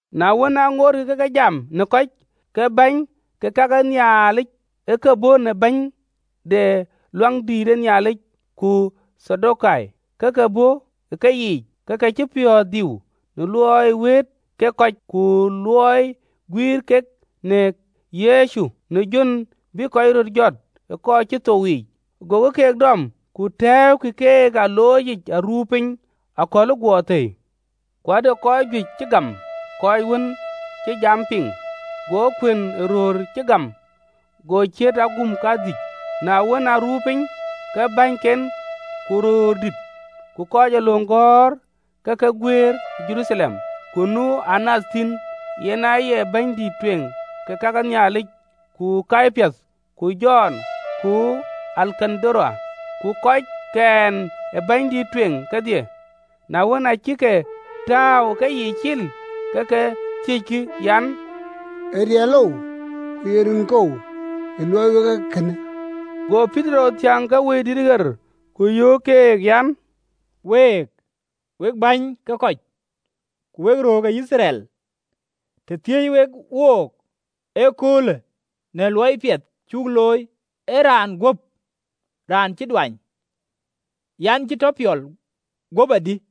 Na wën, aŋootkï ke ke jam në kɔc, go bäny ke ka ke Nhialic ku bɛ̈ny ë rem de Luaŋdït ku Thadokai, bɛ̈n ë keyiic. Acïk piɔ̈ɔ̈th diu në luɔi wëët kek kɔc, ku në luɔi guïïr kek kɔc këde Yecu në jön bï kɔc röt jɔt ë kɔc cï thou yiic. Gokï keek dɔm, ku tɛ̈ɛ̈ukï keek ë aloocic aruu piny: në luɔi cï akɔ̈l guɔ thëi. Ku ade kɔc juëc cï gam kɔc wën cï jam piŋ, go kuën ë röör cï gam go ciët aguum kadhïc. Na wën, aruu piny, ke bäny ke Judai, ku röördït ku kɔc ee löŋ gɔ̈ɔ̈r ë ke guëër Jeruthalem. Ku nu Anath thïn, yen aye bɛ̈nydïït ë kake Nhialic, ku Kayapath, ku Jɔn, ku Alekandaro, ku kɔc ke dhiën ë bɛ̈nydït tueŋ kedhie. Na wën, aa cïk ke tääu ë keyiic cil, ke ke thiëckï an, “Ee riɛlou, ku ye rinkou ë luɔɔi wek ee kënë?” Go Petero thiäŋ në Wëidït ɣer, ku yöök keek an, “Week, we bäny ke kɔc, ku wek röördït ke Yithriɛl: të thiëëc wek wook ëköölë në luɔi piɛth cuk looi ë raanë guöp raan cï duanyë an, cï tɔ piɔl guöp adï,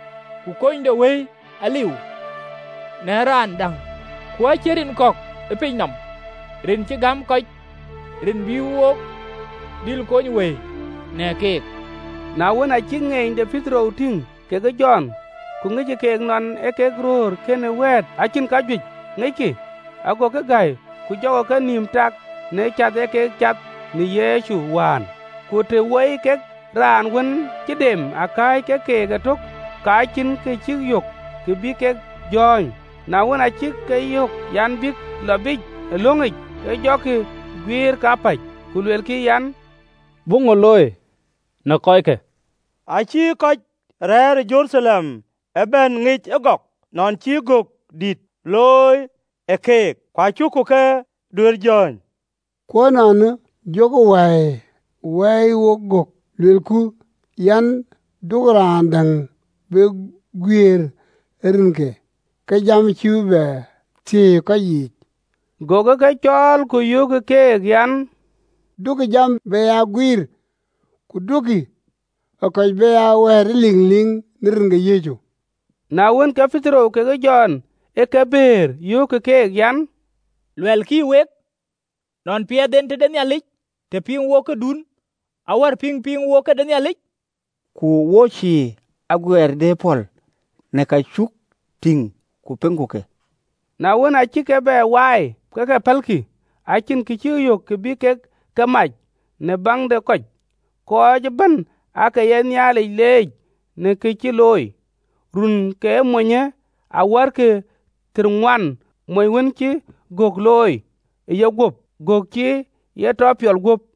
Ku kunydewëi aliu në raan däŋ: ku acïn rin kɔ̈k ë pinynɔm, rin cï gäm kɔc, rin bï wo dhil kony wëi në keek.” Na wën, aa cïk ŋeeny de Petero tïŋ kekë Jɔn, ku ŋickï keek nɔn ee kek röör kënë wɛ̈ɛ̈t, acïn kajuëc ŋickï agokï gäi, ku jɔkï kenïïm tak në cath ë ye kek cath në Yecu wään. Ku të woi kek raan wën cï dem akääc ke keek ëtök, ka cïn kë cïk yök kë bïk jɔ̈ɔ̈ny. Na wën, aa cïk ke yɔ̈ɔ̈k an, bïk lɔ biic ë löŋic, ke jɔkï guiir kapäc. Ku luelkï an, “Buk ŋö looi në kɔckë?” Acï kɔc rɛ̈ɛ̈r ë Jeruthalem ëbɛ̈n ŋic ëgɔk nɔn cï gök dït looi në keek, ku acuku ke duëër jɔ̈ɔ̈ny. Ku ënɔɔnë, jɔku ke waai ë wɛ̈i gök, luelku an, “Duökï raan däŋ be guiëër ë rinke, ke jam cïï bï thiëi ë kɔc yiic.” Gokï ke cɔɔl, ku yöökkï keek an, duökï jam be ya guiir ku duökï kɔc be ya wɛ̈ɛ̈t ëliŋliŋ në rin ke Yecu. Na wën, ke Petero kekë Jɔn ë ke bëër, yöökkï keek an, “Luɛlkï week, nɔn piɛth en tëde Nhialic të piŋ wok këdun awär pïŋ piŋ wok këde Nhialic. Ku wo cïï aguiɛɛr duëër pɔ̈l në ka cuk tïŋ ku piŋku ke.” Na wën acïk ke bɛ waai, ke ke pälkï, acïn kë cïk yök kë bï kek ke mac, në baŋ de kɔc, kɔc ëbɛ̈n aake ye Nhialic leec në ke cï looi. Run ke monyë awärkï thiërŋuan, mony wën cï gökë looi ë yeguöp, gök cï e tɔ piɔl guöp.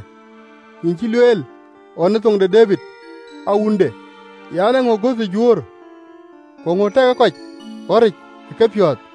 (LXX). Yïn acï lueel ɣɔn në thoŋ de Debid awunde në jam de Wëidït ɣer an, ‘Eeŋö ë göthë juöör, ku eeŋö ë tɛkë kɔc ɣɔ̈ric ë kepiɔ̈ɔ̈th?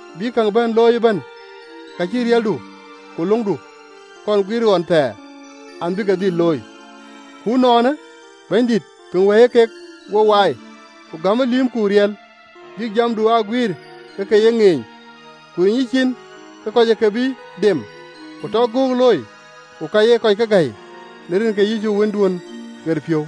bïk käŋ bɛ̈n looi ëbɛ̈n, ka cïï riɛldu ku löŋdu kɔn guiir ɣɔn thɛɛr an, bï ke dhil looi. Ku ënɔɔnë, Bɛ̈nydït, piŋ wɛ̈i ee kek wo waai, ku gämë lïïmku riɛl, bïk jamdu aa guiir ke ke ye ŋeeny, ku riny yïcin ke kɔc ë ke bï dem, ku tɔ göök loi ku ka ye kɔc ke gäi në rin ke Yecu Wënduön ɣeric”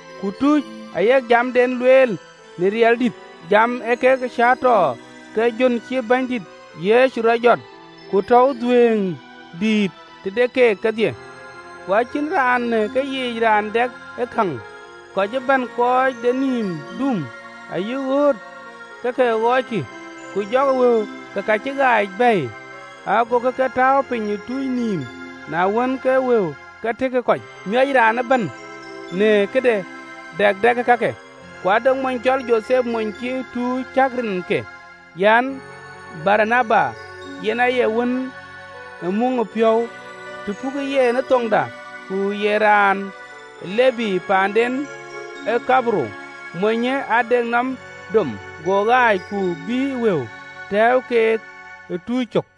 Ku tuuc ayek jamden lueel në riɛldït, jam ee kek cäätɔɔ ke jön cï Bɛ̈nydït Yecu rɔt jɔt: ku tɔ̈u dhuëëŋ dït tëde keek kedhie. Ku acïn raan në keyiic raan dɛk ë käŋ, kɔc ëbɛ̈n kɔc de nïïm duum ayï ɣööt ke ke ɣɔɔckï, ku jɔkï wëu ke ka cï ɣaac bɛ̈ɛ̈i, gokï ke tääu piny ë tuuc nïïm: na wën, ke wëu ë ke tëkë kɔc, ku miɔc raan ëbɛ̈n në këde dak dɛkë kake. Ku ade mony cɔl Jothep, mony cï tuuc cäk rinke an, Baranaba (yen aye wën ë Muŋdepiɔ̈u, të pukë yen ë thoŋda), ku ye raan ë Lebi, paanden ee Thaiperuth, monyë ade nɔm dom, go ɣaac, ku bïï wëu, tɛ̈ɛ̈u keek ë tuuc cök.